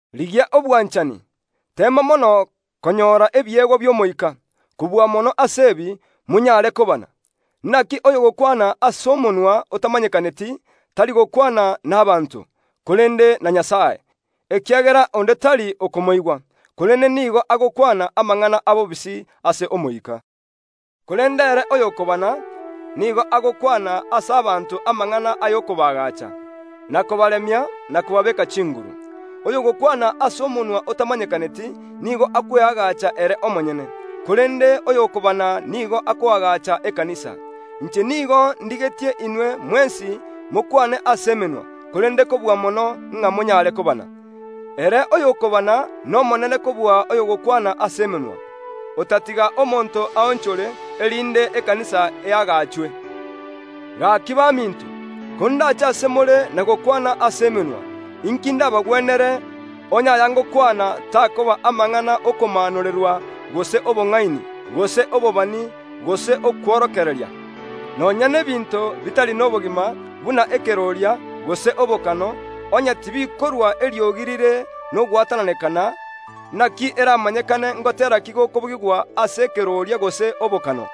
Rigia obwanchani, teema mono konyora ebiegwa bi’Omoika; kobua mono ase ebi, monyare kobana. Naki oyogokwana ase omonwa otamanyekaneti, tari gokwana nabaanto, korende na Nyasae, ekiagera onde tari okomoigwa, korende nigo agokwana amang’ana abobisi ase Omoika. Korende ere oyokobana, nigo agokwana ase abanto amang’ana ay’okobaagacha, na kobaremia, na kobabeeka chinguru. Oyogokwana ase omonwa otamanyekaneti nigo akweagacha ere omonyene; korende oyokobana nigo akoagacha ekanisa. Inche nigo ndigetie inwe mwensi mokwane ase emenwa, korende kobua mono ng’a monyare kobana. Ere oyokobana nomonene kobua oyogokwana ase emenwa, otatiga omonto aonchore, erinde ekanisa eagachwe. Gaki baminto, kondache ase more na gokwana ase emenwa, inki ndabagwenere, onye aya ngokwana takoba amang’ana ’okomaanorerwa gose obong’aini, gose obobani, gose okworokereria? Nonya n’ebinto bitari nobogima, buna ekeroria, gose obokano, onye tibikorua eriogi rire nogwatananekana, naki eramanyekane ngotera ki gokobugigwa ase ekeroria gose obokano?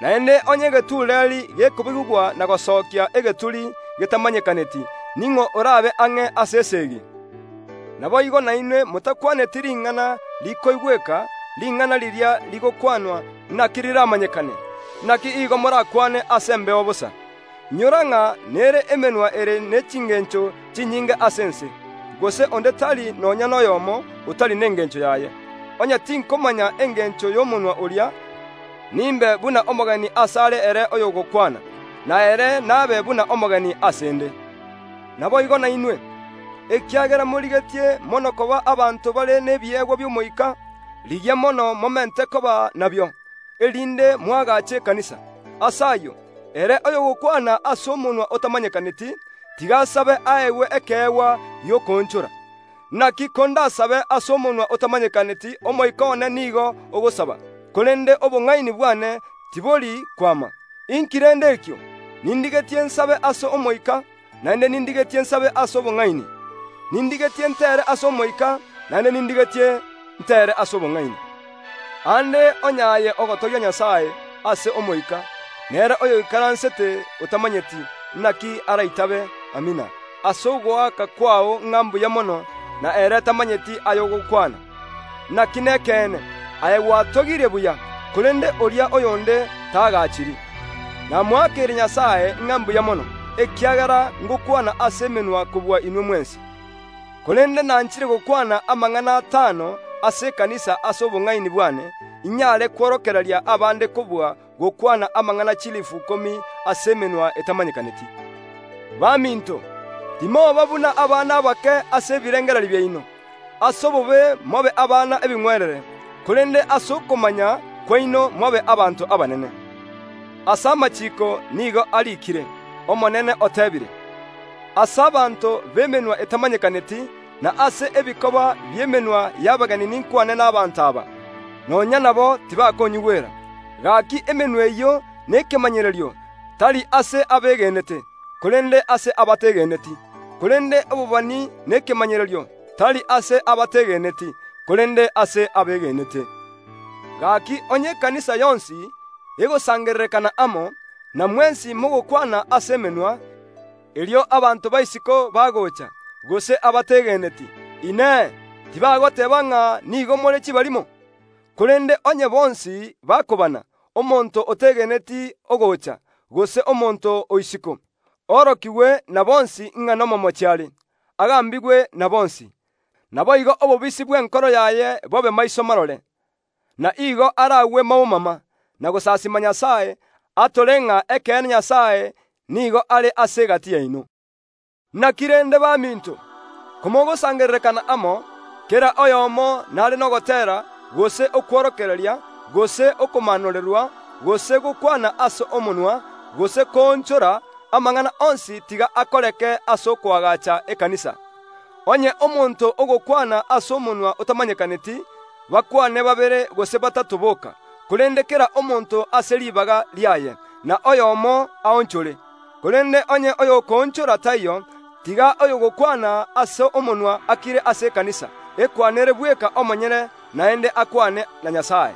Naende onye egetureeri gekobugigwa na gosokia egeturi getamanyekaneti, ning’o orabe ang’e ase esegi? Naboigo nainwe motakwaneti ring’ana rikoigweka, ring’ana riria rigokwanwa, naki riramanyekane? Naki igo morakwane ase embeo bosa. Inyora ng’a nere emenwa ere ne chingencho chinyinge ase ense, gose onde tari nonya noyomo, otari nengencho yaye. Onye tinkomanya engencho y’omonwa oria, nimbe buna omogeni asare ere oyogokwana, na ere nabe buna omogeni ase ’nde. Naboigo nainwe, ekiagera morigetie mono koba abanto bare nebiegwa bi’Omoika, rigia mono momente koba nabio, erinde moagache ekanisa. Ase ayio, ere oyogokwana ase omonwa otamanyekaneti tiga asabe aegwe ekeegwa gi’okoonchora. Naki kondasabe ase omonwa otamanyekaneti omoika one nigo ogosaba, korende obong’aini bwane tibori kwama. Inki rende ekio? Nindigetie nsabe ase omoika, naende nindigetie nsabe ase obong’aini. Nindigetie ntere ase omoika, naende nindigetie ntere ase obong’aini. Aande onye aye ogotogia Nyasae ase omoika, nere oyoikaransete otamanyeti, naki araitabe “Amina” ase ogoaka kwao ng’a mbuya mono, na ere tamanyeti aya ogokwana? Naki nekeene, aye gwatogirie buya, korende oria oyonde taagachiri. Namoakeire Nyasae ng’a mbuya mono, ekiagera ngokwana ase emenwa kobua inwe mwensi; korende nanchire gokwana amang’ana atano ase ekanisa ase obong’aini bwane, inyare kworokereria abande, kobua gokwana amang’ana chilifu ikomi ase emenwa etamanyekaneti. Baminto, timoba buna abana abake ase ebirengererio biaino; ase obobe mobe abana ebing’werere, korende ase okomanya kwaino mobe abanto abanene. Ase amachiiko nigo ariikire, “Omonene oteebire: Ase abanto b’emenwa etamanyekaneti, na ase ebikoba bi’emenwa y’abageni ninkwane nabaanto aba. Nonya nabo tibakonyigwera.” Gaki emenwa eyio nekemanyererio, tari ase abegenete, korende ase abategeneti. Korende obobani nekemanyererio, tari ase abategeneti, korende ase abegenete. Gaki onye ekanisa yonsi, egosangererekana amo, na mwensi mogokwana ase emenwa, erio abanto ba isiko bagocha, gose abategeneti, Inee, tibagoteeba ng’a nigo more chibarimo? Korende onye bonsi bakobana, omonto otegeneti ogocha, gose omonto o isiko, orokigwe na bonsi ng’a nomomochi are, agambigwe na bonsi; naboigo obobisi bw’enkoro yaye bobe maiso marore; na igo aragwe maumama, na gosasiima Nyasae, atore ng’a ekeene Nyasae nigo are ase egati yaino. Naki rende baminto? Komogosangererekana amo, kera oyomo nare nogoteera, gose okworokereria, gose okomaanorerwa, gose gokwana ase omonwa, gose koonchora, amang’ana onsi tiga akoreke ase okoagacha ekanisa. Onye omonto ogokwana ase omonwa otamanyekaneti, bakwane babere gose batato boka, korende kera omonto ase ribaga riaye, na oyomo aonchore. Korende onye oyokoonchora taiyo, tiga oyogokwana ase omonwa akire ase ekanisa, ekwanere bweka omonyene naende akwane na Nyasae.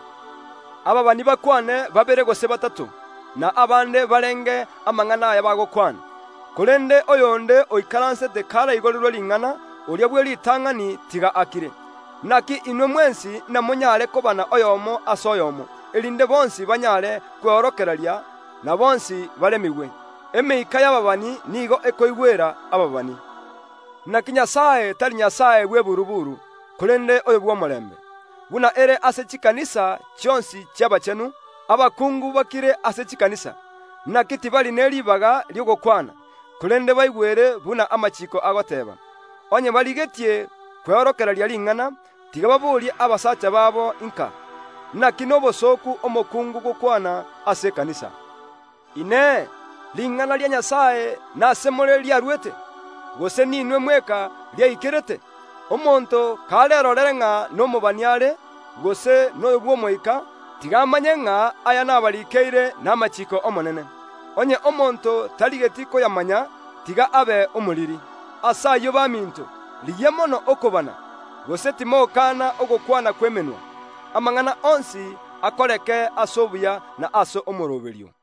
Abaabani bakwane babere gose batato, na abande barenge amang’ana aya bakwana. Korende oyonde oikaransete karaigorerwe ring’ana, oria bw’eritang’ani tiga akire. Naki inwe mwensi namonyare kobana oyomo ase oyomo, erinde bonsi banyare kweorokereria, na bonsi baremigwe. Emeika y’ababani nigo ekoigwera ababani. Naki Nyasae tari Nyasae bw’eburuburu, korende oyo bw’omorembe. Buna ere ase chikanisa chionsi chi’abachenu, abakungu bakire ase chikanisa. Naki tibari ne ribaga ri’ogokwana, korende baigwere buna amachiiko agoteeba. Onye barigetie kweorokereria ring’ana, tiga baborie abasacha babo inka. Naki nobosooku omokungu gokwana ase ekanisa. Inee! Ring’ana ria Nyasae nasemore riarwete, gose ninwe mweka riaikerete? Omonto karerore ng’a nomobani are, gose noyo bw’Omoika, tiga amanye ng’a aya nabarikeire namachiiko ’Omonene. Onye omonto tarigeti koyamanya, tiga abe omoriri. Ase ayio baminto, rigia mono okobana, gose timokana ogokwana kw’emenwa. Amang’ana onsi akoreke ase obuya na ase omooroberio.